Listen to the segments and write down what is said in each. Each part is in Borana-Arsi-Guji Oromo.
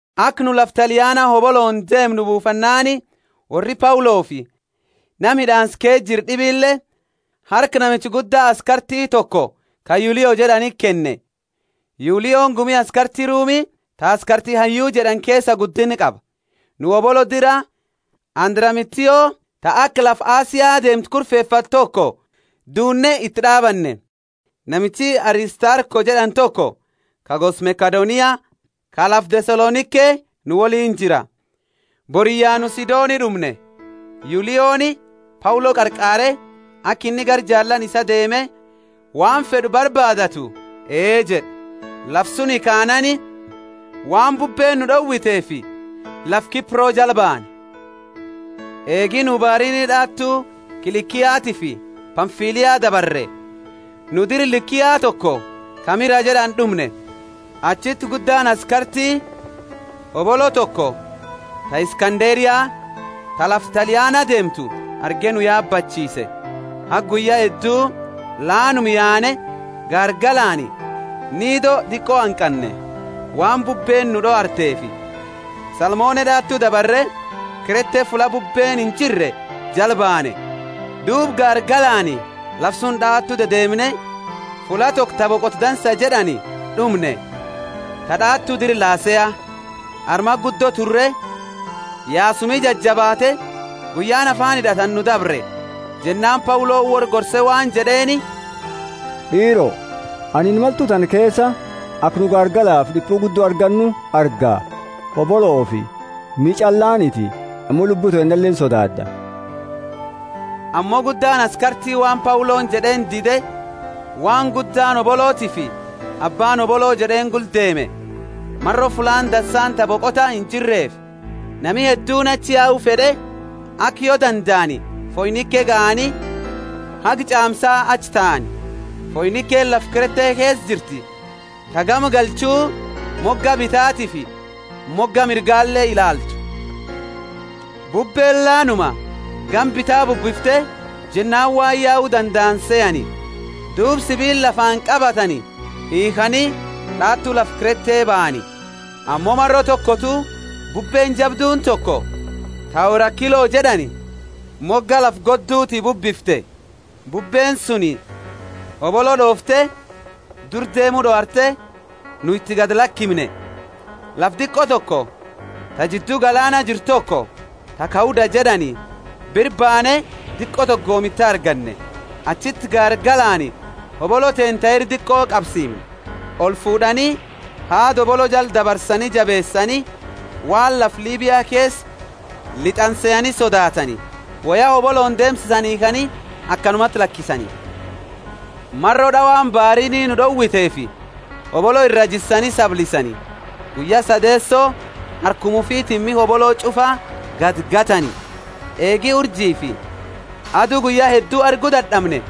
Aka nu lafa Taliana hobolooni deemu buufannaani worri Paulofi nama hid'aansa keesa jiru d'ibile harka namicha gudda askarti toko ka Yulio jed'aniti kenne, Yulioni gumi askarti Rumi ta askarti hayyu jed'ani keesa guddinna qaba. Nu hobolo dira Andramitio ta aka lafa Asia deemtu kurfefate toko duunne iti d'aabanne. Namichi Aristarko jed'ani toko ka gosa Makedonia ka lafa Thesalonike nu woliini jira. Boriyya nu Sidoni d'umne. Yulioni Paulo qarqaare, aka inni gara jaalaani isaa deeme waan fed'u barbaadatu ee jed'e. Lafa suni kaanaani waan bubbeeni nu d'owiteefi lafa Kipro jala baane. Eegi nu baariini d'awatu kilikiatifi Pamfilia dabarre, nu dira Likia toko ka Mira jed'ani d'umne. Achiti guddaani askarti hobolo toko ta Iskanderia, ta lafa Taliana deemtu arge nu yaabachiise. Haga guyya heddu laanuma yaane gaargalaani Nido diqo hanqanne. Waan bubbeeni nu d'owarteefi Salmone d'aatu dabarre, Krete fulla bubbeeni injirre jala banne. Duuba gaargalaani lafa suni d'awatu dedeemne, fulla toko ta Boqota Dansa jed'ani d'umne, ta d'awatu dira Lasea. Armati guddo turre, yaasumi jajabaate, guyyaani afaani hid'atani nu dabre. Jennaani Pauloni worra gorse waan jed'eeni, D'iiro, anini imaltu tana keesa aka nu gaargalafi d'ipu guddo argannu arga; hoboloofi miha ch'allaaniti, ammo lubbu teennale insodaad'a. Ammo guddaani askarti waan Pauloni jed'eeni dide, waan gudda hobolotiifi abbaani hobolo jed'eeni gula deeme. Maro fullaani dansaani ta boqotani injirreefi, nami hedduuni achi yau fed'e, aka yo dandaani Foinike gahani, haga ch'aamsa achi taani. Foinikeni lafa Krete keesa jirti, ta gama galchu moga bitatiifi moga mirgale ilaaltu. Bubbeeni laanuma gama bita bubbifte jennaani waan yau dandaani sehani; duuba sibiila lafaani qabatani hiikhani d'awatu lafa Krete bahani. Ammo maro tokotu bubbeeni jabduuni toko, ta Eurakilo jed'ani, moga lafa godduti bubbifte. Bubbeeni suni hobolo d'oofte, dura deemu d'owarte, nu iti gadi lakimne. Lafa diqo toko, ta jiddu galaana jirtu toko, ta Kauda jed'ani, bira baane diqo toko goomita arganne. Achiti gaargalaani hobolo teenna ta ira diqo qabsiimne. Olfuud'ani, haada hobolo jala dabarsani jabeesani, waan lafa Libia keesa lit'ani sehani sodaatani. Woya hobolooni deemsisani hiikhani akanumati lakisani. Maro d'awani baariini nu d'owiteefi, boriyya ulfinna hoboloo iraa jissani sablisani. Guyya sadeeso harkuma ufitiini miha hobolo ch'ufa gadigatani. Eegi urjifi adu guyya heddu argu dad'amne,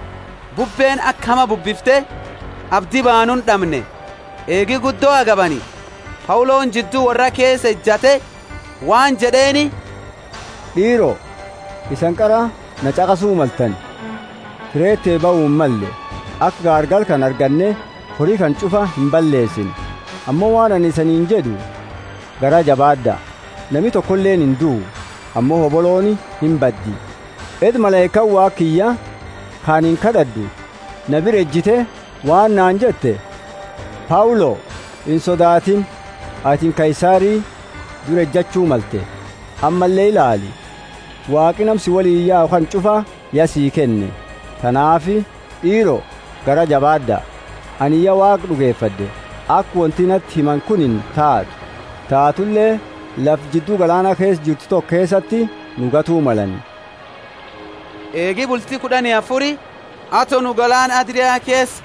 bubbeeni aka hama bubbifte, abdi baanuuni d'amne. Eegi guddo agabani, Pauloni jiddu worra keesa ejate waan jed'eeni, D'iiro, isani qara naa ch'aqasu maltani, Krete bahu himmalle, aka gaargala kana arganne hori kana ch'ufa imballeesine. Ammo waan anini isaniini jed'u, Garaa jabaad'a! Nami tokoleeni induu, ammo hobolooni imbaddi. Edda malaikaani Waaqa kiyya, ka anini kad'ad'u, na bira ejatte waan naani jette, Paulo, insodaatini, atini Kaisari dura ejachu malte; ammalle ilaali, Waaqi nama si woliini yau kana ch'ufa ya sii kenne. Tanaafi, d'iiro, garaa jabaad'a! Anini ya Waaqa d'ugefad'e, aka wonti nati himani kuni taatu. Taatule lafa jiddu galaana keesa jirtu toko keesati nu gatu malani. Eegi bulti kud'ani afuri, ato nu galaana Adria keesa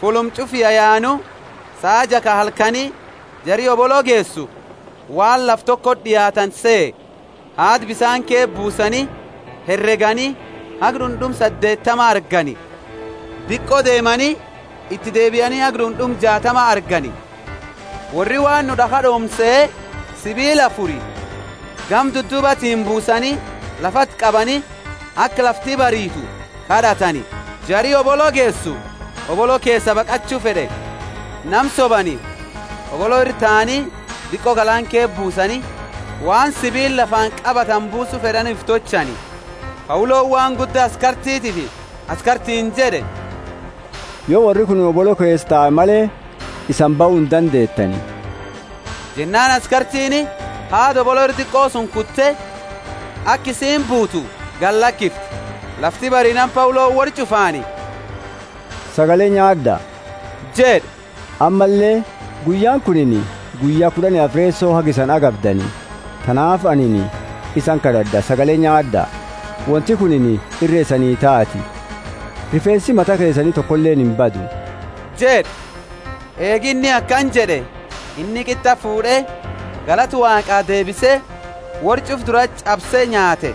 fulluma ch'ufa yayaanu, saa jaa ka halkani, jari hobolo geesu waan lafa tokoti d'iaatani sehe. Haada bisaani keesa buusani, heregani, haga d'und'uma saddeetama argani. Diqo deemani, iti deebiani haga d'und'uma jaatama argani. Worri waan nu d'akha d'oomnu sehe, sibiila afuri gama dudduubatiini buusani, lafati qabani, aka lafti bariitu kad'atani. Jari hobolo geesu hobolo keesaa baqachu fed'e; nama sobani hobolo ira taani diqo galaana keesa buusani, waan sibiila lafaani qabatani buusu fed'ani ufi tolchani. Pauloni waan gudda askartitiifi askartiini jed'e, Yo worri kunini hobolo keesa tae male, isani bahu indandeetani. Jennaani askartiini haada hobolo ira diqo suni kute, aka isiini buutu gadilakifte. Lafti bariinaani Pauloni worra ch'ufaani, Sagale nyaad'a jed'e; ammalle, guyyaani kunini guyya kud'ani afreesoti haga isani agabdani. Tanaafi anini isani kad'ad'a, sagale nyaad'a; wonti kunini irre isani taati. Rifeensi mata keesani tokoleeni imbadu jed'e. Eegi inni akana jed'e, inni qit'a fuud'e, galata Waaqaa deebise, worra ch'ufa durati ch'abse nyaate.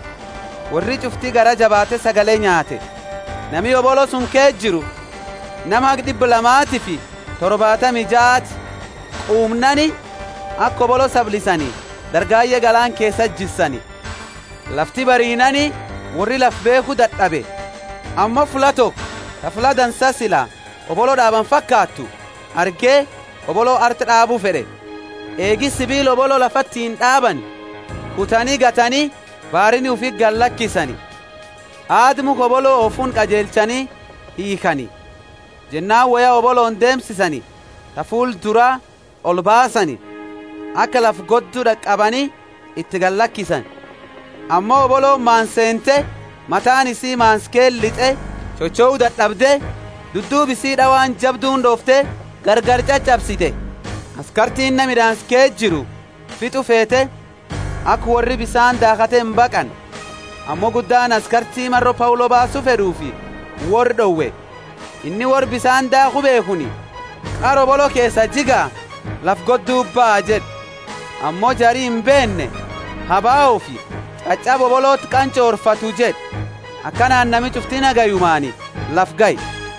Worri ch'ufti garaa jabaate sagale nyaate. Nami hobolo suni keesa jiru nama haga d'ibba lamatifi torbaatami jaati. Quumnaani aka hobolo sablisani dargaye galaana keesati jissani. Lafti bariinaani worri lafa beekhu dad'abe, ammo fulla toko ta fulla dansa sila hoboloo d'abani fakaatu, arge hobolo arti d'aabu fed'e. Eegi sibiila hobolo lafatiini d'aabani, kutani gatani baariini ufiti gallakisani, haada mukha hobolo oofuni qajeelchani hiikhani. Jennaani woya hobolooni deemsisani ta fuula duraa olbaasani, aka lafa goddu d'aqabani iti gallakisani. Ammo hobolooni maansa seente mataani isii mansa keesa lit'e chochou dad'abde, dudduuba isi d'awaan jabduuni d'oofte gargari ch'ach'absite. Askartiini nama hid'aansa keesa jiru fit'u feete, aka worri bisaani daakhatte imbaqanne. Ammo guddaani askarti maro Paulo baasu fed'eefi worra d'owe. Inni worra bisaani daakhu beekhuni qara hobolo keesaa jigaa lafa godduti baha jed'e, ammo jari imbeenne ha baofi ch'ach'aba hoboloti qanch'orfatu, jed'e. Akanaani nami ch'ufti nagayumaani lafa gahe.